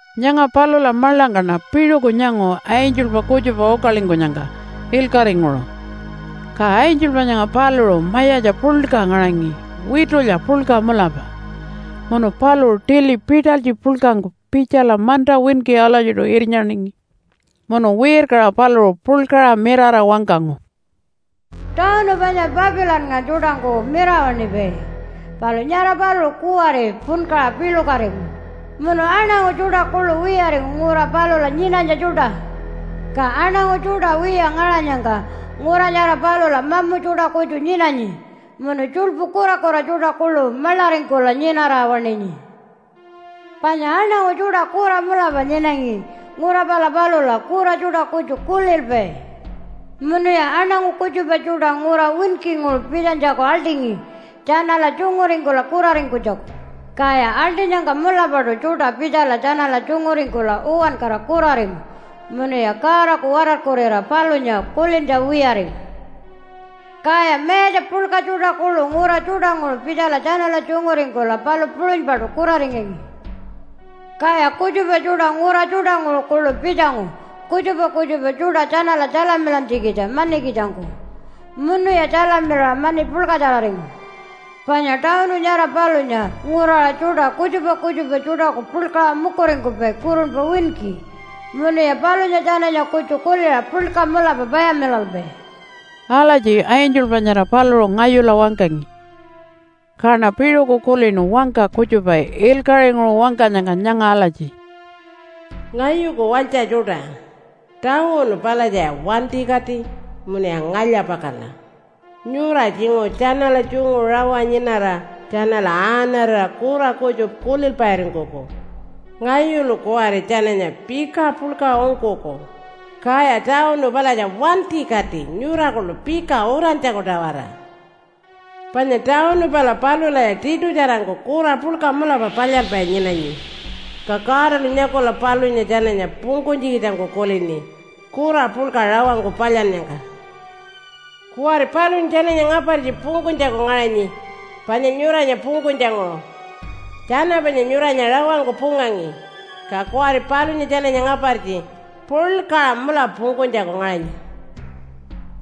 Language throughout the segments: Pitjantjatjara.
Nyanga palula maḻangkaṉa piṟuku nyangu angelpa kutjupa ukalingkunyangka ilkaṟinguṟu. Ka angelpa nyanga paluṟu mayatja puḻka ngaṟangi witulya puḻka mulapa. Munu paluṟu tili pitalytji puḻkangku pitjala manta winki alatjiṯu irnyaningi. Munu wirkaṟa paluṟu puḻkaṟa mirara wangkangu, “Tawunu panya Papilannga tjuṯangku mirawaṉipai, palu nyara paluṟu kuwari punkaṟa piḻukatingu, munu aṉangu tjuṯa kuḻu wiyaringu ngura palula nyinanytja tjuṯa. Ka aṉangu tjuṯa wiya ngaṟanyangka ngura nyara palula mamu tjuṯa kutju nyinanyi munu tjuḻpu kurakura tjuṯa kuḻu maḻaringkula nyinara waṉinyi. Panya aṉangu tjuṯa kura mulapa nyinangi ngura pala palula, kura tjuṯa kutju kulilpai. Munuya aṉangu kutjupa tjuṯa ngura winkinguṟu pitjanytjaku aḻṯingi tjanala tjunguringkula kuraringkunytjaku, kaya aḻṯinyangka mulapaṯu tjuṯa pitjala tjanala tjunguringkula uwankara kuraringu munuya Godaku watarkurira palunya kulintja wiyaringu. Kaya mayatja puḻka tjuṯa kuḻu ngura tjuṯanguṟu pitjala tjanala tjunguringkula palu puṟunypaṯu kuraringangi. Kaya kutjupa tjuṯa ngura tjuṯanguṟu kuḻu pitjangu kutjupa kutjupa tjuṯa tjanala tjalamilantjikitja manikitjangku, munuya tjalamilaṟa mani puḻkatjararingu. Panya tawunu nyara palunya nguraṟa tjuṯa kutjupa kutjupa tjuṯaku puḻkaṟa mukuringkupai kurunpa winki, munuya palunya tjananya kutju kuliṟa puḻka mulapa payamilalpai.” Alatji angelpa nyara paluṟu ngayula wangkangi. Kaṉa piṟuku kulinu wangka kutjupa ilkaṟinguṟu wangkanyangka nyanga alatji, “Ngayuku walytja tjuṯa, tawunu palatjaya wantikati munuya ngalya-pakala. Nyura tjinguṟu tjanala tjungu rawa nyinara tjanala aaṉarira kura kutju kulilpairingkuku. Ngayulu kuwari tjananya pika puḻka ungkuku, kaya tawunu palatja wantikati nyura kuḻu pika urantjaku-tawara. Panya tawunu pala palulaya tiṯutjarangku kura puḻka mulapa palyalpai nyinanyi. Ka Godalu nyakula palunya tjananya pungkunytjikitjangku kulini kura puḻka rawangku palyannyangka. Kuwari palunya tjananya ngapartji pungkunytjaku ngaṟanyi panya nyuranya pungkunytjanguṟu. Tjana panya nyuranya rawangku pungangi, ka kuwari palunya tjananya ngapartji puḻkaṟa mulapa pungkunytjaku ngaṟanyi.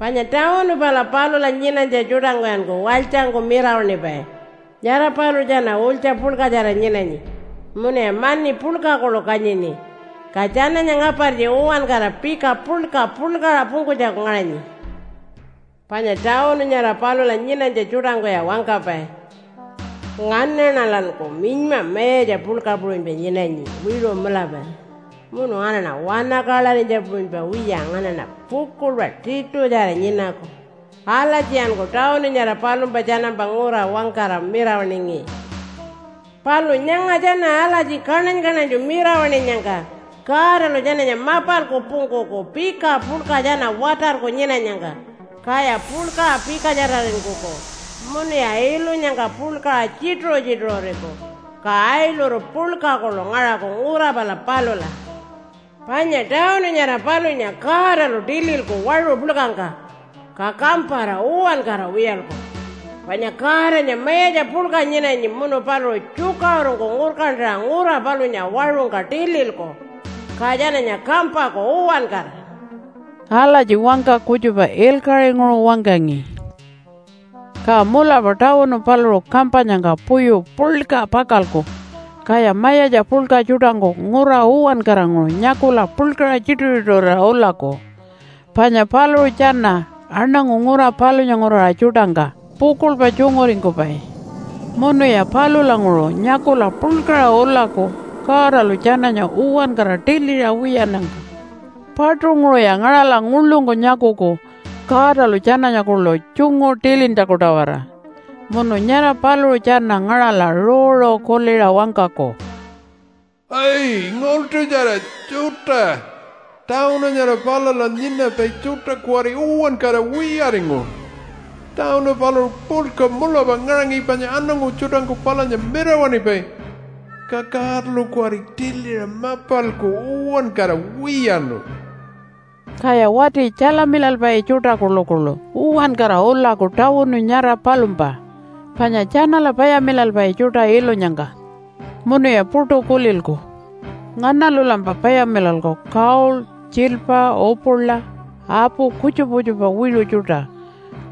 Panya tawunu pala palula nyinanytja tjuṯangkuyanku walytjangku mirawaṉipai. Nyara paluṟu tjana ulytja puḻkatjara nyinanyi munuya mani puḻka kuḻu kanyini. Ka tjananya ngapartji uwankara pika puḻka puḻkaṟa pungkunytjaku ngaṟanyi. Panya tawunu nyara palula nyinanytja tjuṯangkuya wangkapai, ‘Nganaṉalanku minyma mayatja puḻka puṟunypa nyinanyi wiṟu mulapa. Munu nganaṉa wanakaḻarinytja puṟunypa wiya nganaṉa pukuḻpa tiṯutjara nyinaku.’ Alatjiyanku tawunu nyara palumpa tjanampa ngura wangkara mirawaṉingi. Palu nyanga tjana alatji kaṉany-kaṉanytju mirawaṉinyangka Godalu tjananya mapalku pungkuku pika puḻka tjana watarku nyinanyangka. Kaya puḻkaṟa pikatjararingkuku, munuya ilunyangka puḻkaṟa tjituṟu-tjituṟuriku, ka ailuru puḻka kuḻu ngaṟaku ngura pala palula. Panya tawunu nyara palunya Godalu tililku waṟu puḻkangka, ka kampara uwankara wiyalku. Panya Godanya mayatja puḻka nyinanyi munu paluṟu tjukaṟurungku ngurkantaṟa ngura palunya waṟungka tililku, ka tjananya kampaku uwankara.” Alatji wangka kutjupa ilkaṟinguṟu wangkangi. Ka mulapa tawunu paluṟu kampanyangka puyu puḻka pakalku, kaya mayatja puḻka tjuṯangku ngura uwankaranguṟu nyakula puḻkaṟa tjituṟu-tjituṟurira ulaku. Panya paluṟu tjana aṉangu ngura palunya nguraṟa tjuṯangka pukuḻpa tjunguringkupai. Munuya palulanguṟu nyakula puḻkaṟa ulaku Godalu tjananya uwankara tiliṟa wiyannyangka. Paṯunguṟuya ngaṟala nguḻungku nyakuku Godalu tjananya kuḻu tjungu tilintjaku-tawara. Munu nyara paluṟu tjana ngaṟala ruuru kuliṟa wangkaku, “Ai, ngaḻṯutjara tjuṯa. Tawunu nyara palula nyinapai tjuṯa kuwari uwankara wiyaringu. Tawunu paluṟu puḻka mulapa ngaṟangi panya aṉangu tjuṯangku palunya mirawaṉipai. Ka Godalu kuwari tiliṟa mapalku uwankara wiyaṉu.” Kaya wati tjalamilalpai tjuṯa kuḻukuḻu uwankara ulaku tawunu nyara palumpa, panya tjanala payamilalpai tjuṯa ilunyangka. Munuya puṯu kulilku, “Nganalulampa payamilalku gold, tjiilpa, upula, apu kutjupa kutjupa wiṟu tjuṯa?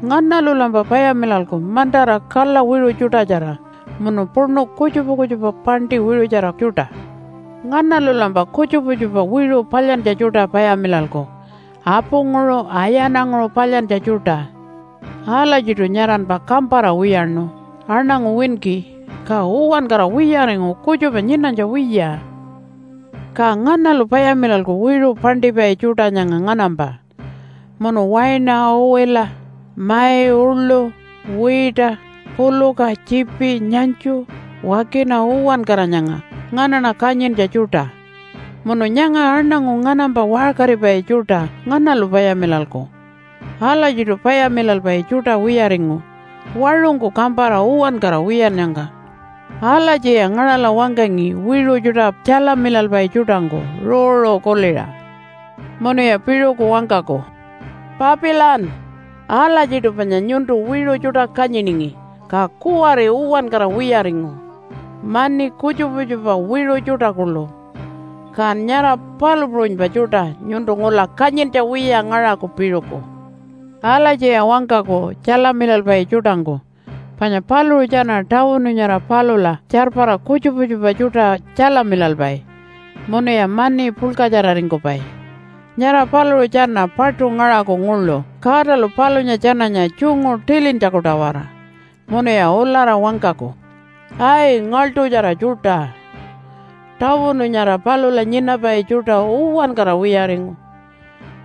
Nganalulampa payamilalku mantara kala wiṟu tjuṯatjara munu puṉu kutjupa kutjupa paṉṯi wiṟutjara tjuṯa? Nganalulampa kutjupa kutjupa wiṟu palyantja tjuṯa payamilalku apunguṟu ayananguṟu palyantja tjuṯa. Alatjiṯu nyaranpa kampara wiyaṉu aṉangu winki, ka uwankara wiyaringu kutjupa nyinanytja wiya. Ka nganalu payamilalku wiṟu paṉṯipai tjuṯa nyanga nganampa, munu waina, uwila, mai uḻu, wiita, puluka, tjiipi, nyanytju, wakina uwankara nyanga nganaṉa kanyintja tjuṯa? Munu nyanga aṉangu nganampa waṟkaripai tjuṯa nganalu payamilalku? Alatjiṯu payamilalpai tjuṯa wiyaringu waṟungku kampara uwankara wiyannyangka.” Alatjiya ngaṟala wangkangi wiṟu tjuṯa tjalamilalpai tjuṯangku ruuru kuliṟa. Munuya piṟuku wangkaku, “Papilan! Alatjiṯu panya nyuntu wiṟu tjuṯa kanyiningi ka kuwari uwankara wiyaringu, mani, kutjupa kutjupa wiṟu tjuṯa kuḻu. Kan nyara palu puṟunypa tjuṯa nyuntu ngula kanyintja wiya ngaṟaku piṟuku.” Alatjiya wangkaku tjalamilalpai tjuṯangku panya paluṟu tjana tawunu nyara palula tjarpara kutjupa kutjupa tjuṯa tjalamilalpai munuya mani puḻkatjararingkupai. Nyara paluṟu tjana paṯu ngaṟaku nguḻu Godalu palunya tjananya tjungu tilintjaku-tawara. Munuya ulara wangkaku, “Ai, ngaḻṯutjara tjuṯa. Tawunu nyara palula nyinapai tjuṯa uwankara wiyaringu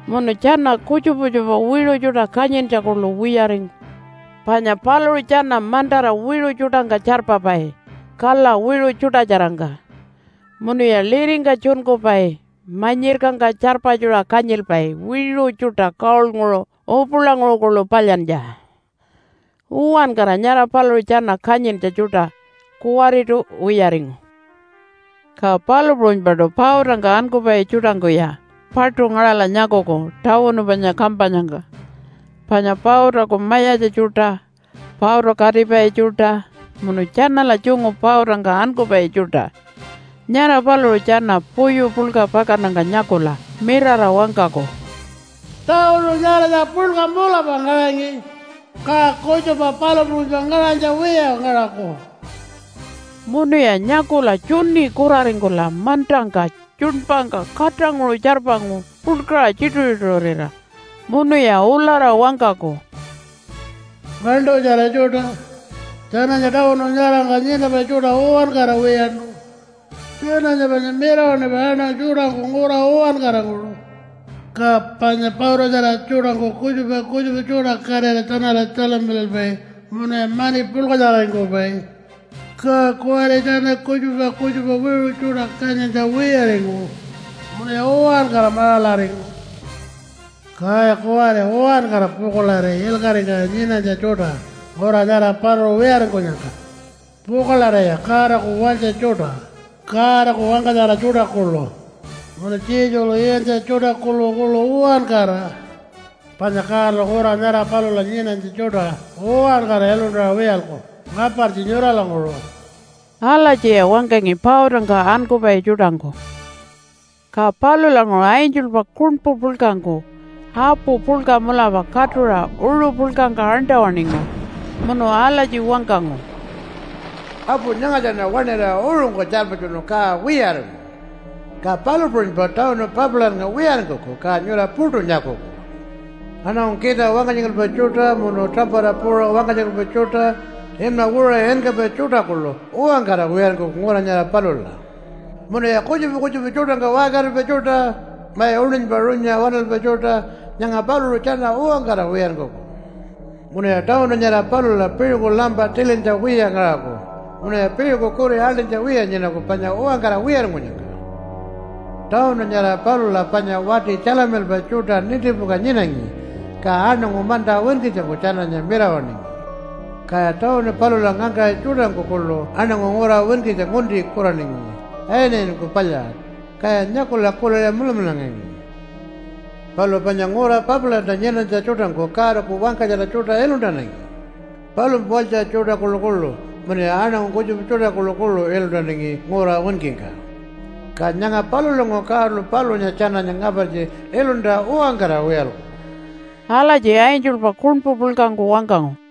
munu tjana kutjupa kutjupa wiṟu tjuṯa kanyintja kuḻu wiyaringu. Panya paluṟu tjana mantara wiṟu tjuṯangka tjarpapai kala wiṟu tjuṯatjarangka, munuya liringka tjunkupai, manyirkangka tjarpatjura kanyilpai wiṟu tjuṯa gold-nguṟu upulanguṟu kuḻu palyantja. Uwankara nyara paluṟu tjana kanyintja tjuṯa kuwariṯu wiyaringu.” Ka palu puṟunypaṯu pautangka ankupai tjuṯangkuya paṯu ngaṟala nyakuku tawunu panya kampanyangka. Panya pautaku mayatja tjuṯa, pauta katipai tjuṯa, munu tjanala tjungu pautangka ankupai tjuṯa, nyara paluṟu tjana puyu puḻka pakannyangka nyakula mirara wangkaku, “Tawunu nyaratja puḻka mulapa ngaṟangi, ka kutjupa palu puṟunypa ngaṟanytja wiya ngaṟaku.” Munuya nyakula tjuni kuraringkula mantangka tjuṉpangka katanguṟu tjarpangu puḻkaṟa tjituṟu-tjituṟurira. Munuya ulara wangkaku, “Ngaḻṯutjara tjuṯa, tjananya tawunu nyarangka nyinapai tjuṯa uwankara wiyaṉu. Tjananya panya mirawaṉipai aṉangu tjuṯangku ngura uwankaranguṟu. Ka panya pautatjara tjuṯangku kutjupa kutjupa tjuṯa katira tjanala tjalamilalpai munuya mani puḻkatjararingkupai. Ka kuwari tjana kutjupa kutjupa wiṟu tjuṯa kanyintja wiyaringu munuya uwankara maṟalaringu. Kaya kuwari uwankara pukuḻari ilkaṟingka nyinanytja tjuṯa ngura nyara paluṟu wiyaringkunyangka. Pukuḻariya Godaku walytja tjuṯa Godaku wangkatjara tjuṯa kuḻu munu Jesulu iyantja tjuṯa kuḻukuḻu uwankara. Panya Godalu ngura nyara palula nyinanytja tjuṯa uwankara iluntaṟa wiyalku ngapartji nyuralanguṟu.” Alatjiya wangkangi pautangka ankupai tjuṯangku. Ka palulanguṟu angelpa kuṉpu puḻkangku apu puḻka mulapa katuṟa uṟu puḻkangka aṉṯa-waṉingu. Munu alatji wangkangu, “Apu nyangatjaṉa waṉira uṟungka tjarpatjunu ka wiyaringu. Ka palu puṟunypa tawunu Papilannga wiyaringkuku, ka nyura puṯu nyakuku. Aṉangu kita wangkatjingalpai tjuṯa munu tuṟampata puuṟa wangkatjingalpai tjuṯa, inma wiṟuṟa inkapai tjuṯa kuḻu uwankara wiyaringkuku ngura nyara palula. Munuya kutjupa kutjupa tjuṯangka waṟkaripai tjuṯa, mai uṉinypa runyuṟa waṉalpai tjuṯa, nyanga paluṟu tjana uwankara wiyaringkuku. Munuya tawunu nyara palula piṟuku lampa tilintja wiya ngaṟaku, munuya piṟuku kuri aḻṯinytja wiya nyinaku panya uwankara wiyaringkunyangka. Tawunu nyara palula panya wati tjalamilalpai tjuṯa nintipuka nyinangi, ka aṉangu manta winkitjangku tjananya mirawaṉingi. Kaya tawunu palula ngangkaṟi tjuṯangku kuḻu aṉangu ngura winkitja ngunti kuraningi ayinayiningku palyaṟa, kaya nyakula kuliṟa mulamularingangi. Palu panya ngura Papilanta nyinanytja tjuṯangku Godaku wangkatjara tjuṯa iluntanangi, palumpa walytja tjuṯa kuḻukuḻu, munuya aṉangu kutjupa tjuṯa kuḻukuḻu iluntanangi ngura winkingka. Ka nyanga palulanguṟu Godalu palunya tjananya ngapartji iluntaṟa uwankara wiyalku.” Alatji angelpa kuṉpu puḻkangku wangkangu.